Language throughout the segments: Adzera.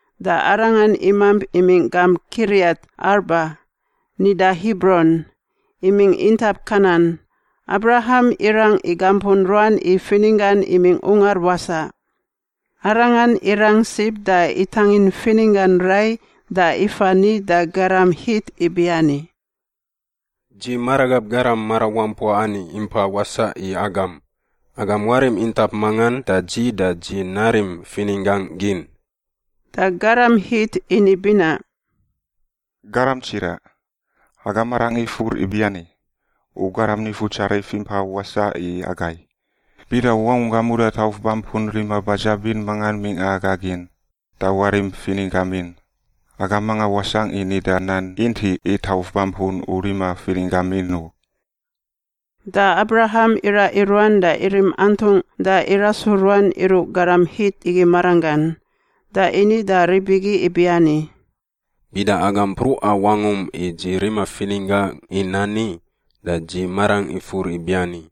Da arangan imamp imingꞌ gamp Kiriat-Arba (nida Hibron), imingꞌ intap Kanan. Abraham irang igampun ruan i fininggan imingꞌ ungar wasaꞌ. Arangan irang sib da itangin fininggan rai da ifa ni da garam Hit ibiani, “Dzi maragab garam marawampua ani impa wasaꞌ i agam. Agam warim intap mangan da dzi da dzi narim fininggangꞌ gin.” Da garam Hit ini binaꞌ, “Garam tsiraꞌ, aga marangꞌ ifur ibiani: U garam nifutsarif impa wasaꞌ i agai. Bida u wangunggam uda tauf bampun rima badzabin mangan mingꞌa aga gin, da warim fininggam in. Aga manga wasangꞌ i nida nan intiꞌ i tauf bampun u rima fininggam in u.” Da Abraham iraꞌ i ruan da irim antungꞌ da irasu ruan iruꞌ garam Hit igi maranggan. Da ini da rib igi ibiani, “Bida agam mpruꞌa wangum i dzi rima fininggangꞌ i nani, da dzi marangꞌ ifur ibiani: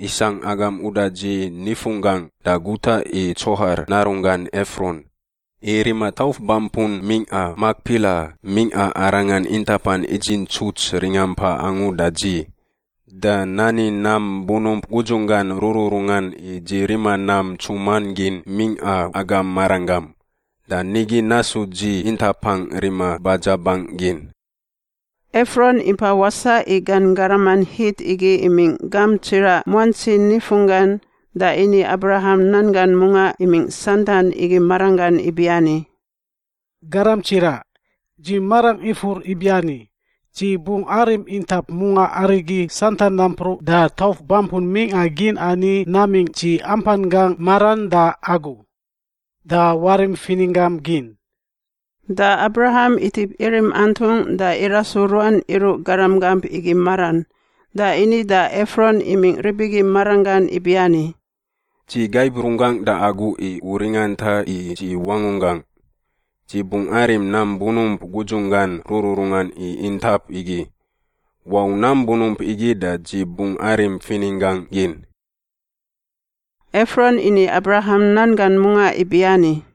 isangꞌ agam uda dzi nifunggangꞌ da guta i Tsohar narunggan Efron, i rima tauf bampun mingꞌa Makpila mingꞌa arangan intapan idzintsuts ringampa angu da dzi. Da nani nam bunump gudzunggan rururungan i dzi rima nam ntsuman gin mingꞌa agam maranggam. Da nigi nasu dzi intapangꞌ rima badzabangꞌ gin.” Efron impa wasaꞌ i gan garaman Hit igi imingꞌ gamp tsiraꞌ muantsi nifunggan da ini Abraham nan gan mungaꞌ imingꞌ santan igi maranggan ibiani, “Garam tsiraꞌ, dzi marangꞌ ifur ibiani: dzi bungꞌ arim intap mungaꞌ arigi santan nampruꞌ da tauf bampun mingꞌa gin ani namingꞌ dzi ampan gangꞌ maran da agu. Da warim fininggam gin.” Da Abraham itip irim antungꞌ da irasu ruan iruꞌ garam gamp igi maran da ini da Efron imingꞌ rib igi maranggan ibiani, “Dzi gaib runggangꞌ da agu i u ringanta i dzi wangunggangꞌ. Dzi bungꞌ arim nam bunump gudzunggan rururungan i intap igi. Wau nam bunump igi da dzi bungꞌ arim fininggangꞌ gin.” Efron ini Abraham nan gan mungaꞌ ibiani,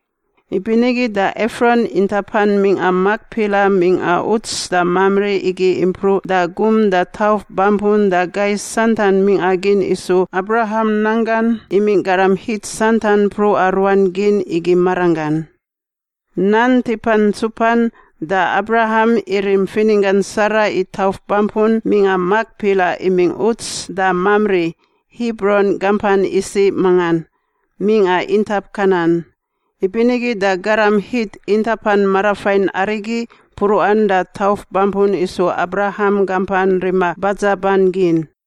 Ibinigi da Efron intapan mingꞌa Makpila mingꞌa uts da Mamri igi impruꞌ da gum da tauf bampun da gai santan mingꞌa gin isu Abraham nanggan imingꞌ garam Hit santan mpruꞌa ruan gin igi maranggan. Nan tipan ntsupan da Abraham irim fininggan Sara i tauf bampun mingꞌa Makpila imingꞌ uts da Mamri (Hibron gampan isiꞌ mangan) mingꞌa intap Kanan. Ibinigi da garam Hit intapan marafain arigi mpruꞌan da tauf bampun isu Abraham gampan rima badzaban gin.